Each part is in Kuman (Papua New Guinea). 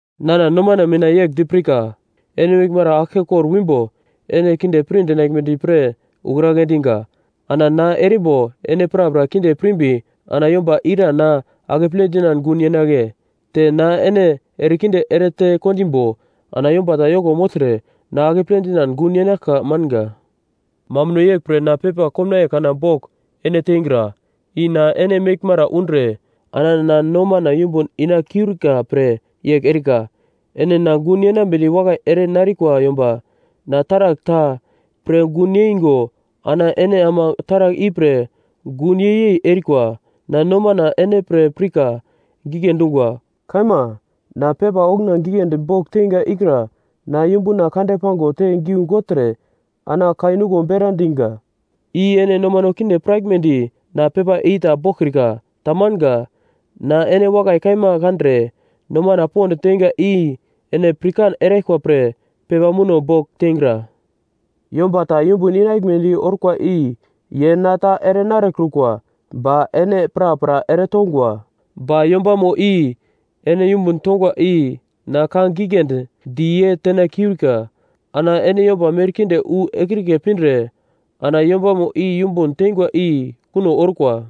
Nana nomana mina yegl di pirka: Ene meglmara aglke kor wimbo ene kinde pir dinaglmedi pre ukragle dinga. Ana na erimbo ene prapra kinde pirmbi ana yomba ira na akeple dinan gun yenagle? Te na ene erekinde erete kondimbo ana yomba ta yoko mogltre na akeple dinan gun yenaglka manga. Mambuno yeglpre na pepa komnaiye kana bogl ene teingra, i na ene meglmara undre ana na nomana yumbun ina kiurika pre yegl erika. Ene na gun yenambedi wakai ere narikwa yomba. Na taragl ta pre gun yeingo ana ene ama taragl ipre gun yei-yei erikwa, na nomana ene pre pirka gigle dungwa. Kaima. Na pepa okuna giglendi bogl teinga ikra na yumbuna kande pango te giu gogltre ana kai nuglo bera dinga, i ene nomano kinde piraglmedi na pepa i ta boglkrika. Tamanga. Na ene wakai kaima kandre nomana pond teinga i ene pirkan eraglkwa pre pepa muno bogl teingra. Yomba ta yumbun inaglmedi orkwa i, ye na ta ere narekrukwa ba ene prapra eretongwa. Ba yombamo i ene yumbun tongwa i na ka giglendi di ye tena kiurika. Ana ene yomba merkinde wu ekrike pindre ana yombamo i yumbun teingwa i kuno orkwa.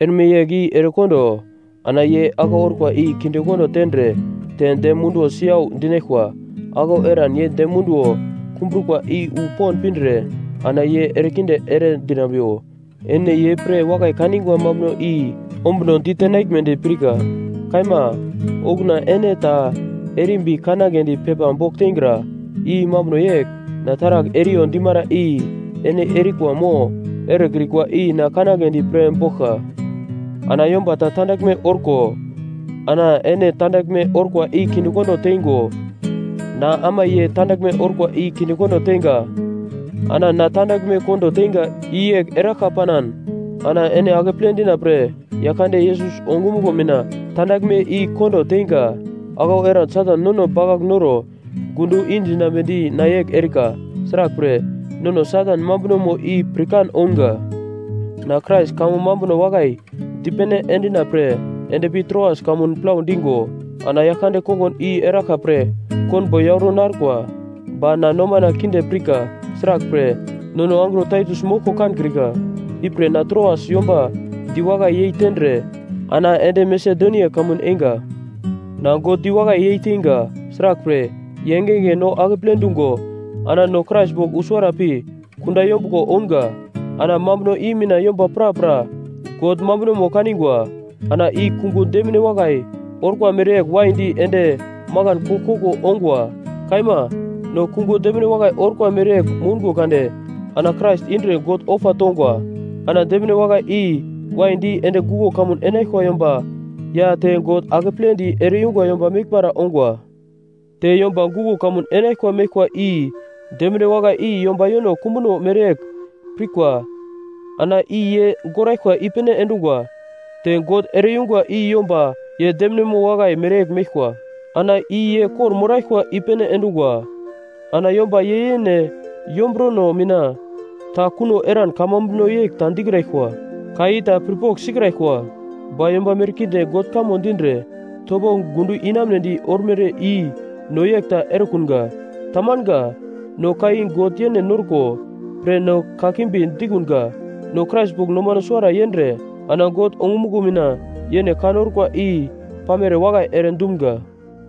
Erme yegl i erekondo ana ye aglau orkwa i kindekondo tendre te dem munduwo siyau dinaglkwa. Aglau eran ye dem munduwo kumbrukwa i wu pond pindre ana ye erekinde ere dinambiwo. Ene ye pre wakai kaningwa mambuno i ombuno ditenaglmedi pirka. Kaima. Okuna ene ta erimbi kangledi pepa bogl teingra, i mambuno yegl, na taragl eriyo dimara i ene erikwa mo erekrikwa i na kanagledi pre boglka. Ana yomba ta tandaglme orko ana ene tandaglme orkwa i kindekondo teingo, na ama ye tandaglme orkwa i kindekondo teinga. Ana na tandaglme kondo teinga, i yegl eraglka panan, ana ene akeple dina pre Yaglkande Yesus ongumuglo mina tandaglme i kondo teinga. Aglau eran Satan nono bakagl noro gundo indinambedi na yegl erika, sraglpre, nono Satan mambunomo i pirkan ounga. Na Krais kamo mambuno wakai dipene endina pre ende pi Troas kamun plau dingo, ana Yaglkande kongun i eraglka pre konbo yauro narkwa. Ba na nomana kinde pirka. Sraglpre, nono angro Taitus moglko kankrika. Ipre na Troas yomba diwakai yei tendre ana ende Masedonia kamun einga. Na God diwakai yeiteinga. Sraglpre, ye engenge no akeple dungo ana no Krais bogl usuwara pi kunda yombuglo ounga. Ana mambuno i mina yomba prapra God mambunomo kaningwa. Ana i kungo demine wakai orkwa mereyegl waidi ende makan koglkoglo ongwa. Kaima. No kungo demine wakai orkwa mereyegl moungo kade ana Krais indre God ofa tongwa. Ana demine wakai i waidi ende guglo kamun enaglkwa yomba ya te God akepledi ere-yungwa yomba meglmara ongwa. Te yomba guglo kamun enaglkwa meglkwa i demine wakai i yomba yono kumbuno mereyegl pirkwa ana i ye goraglkwa i-pene endungwa. Te God ere-yungwa i yomba ye deminemo wakai mereyegl meglkwa ana i ye kor-moraglkwa i-pene endungwa. Ana yomba ye yene yomburono mina ta kuno eran kamambuno yegl ta dikraglkwa ka i ta pir pogl sikraglkwa. Ba yomba merkinde God kamo dindre topo gundo inamunedi ormere i no yegl ta erekunga. Tamanga. No ka i God yene norko pre ana kakimbi dikunga. No Krais bogl nomano suwara yendre ana God ongumuglo mina yene ka norkwa i pamere wakai ere dumga.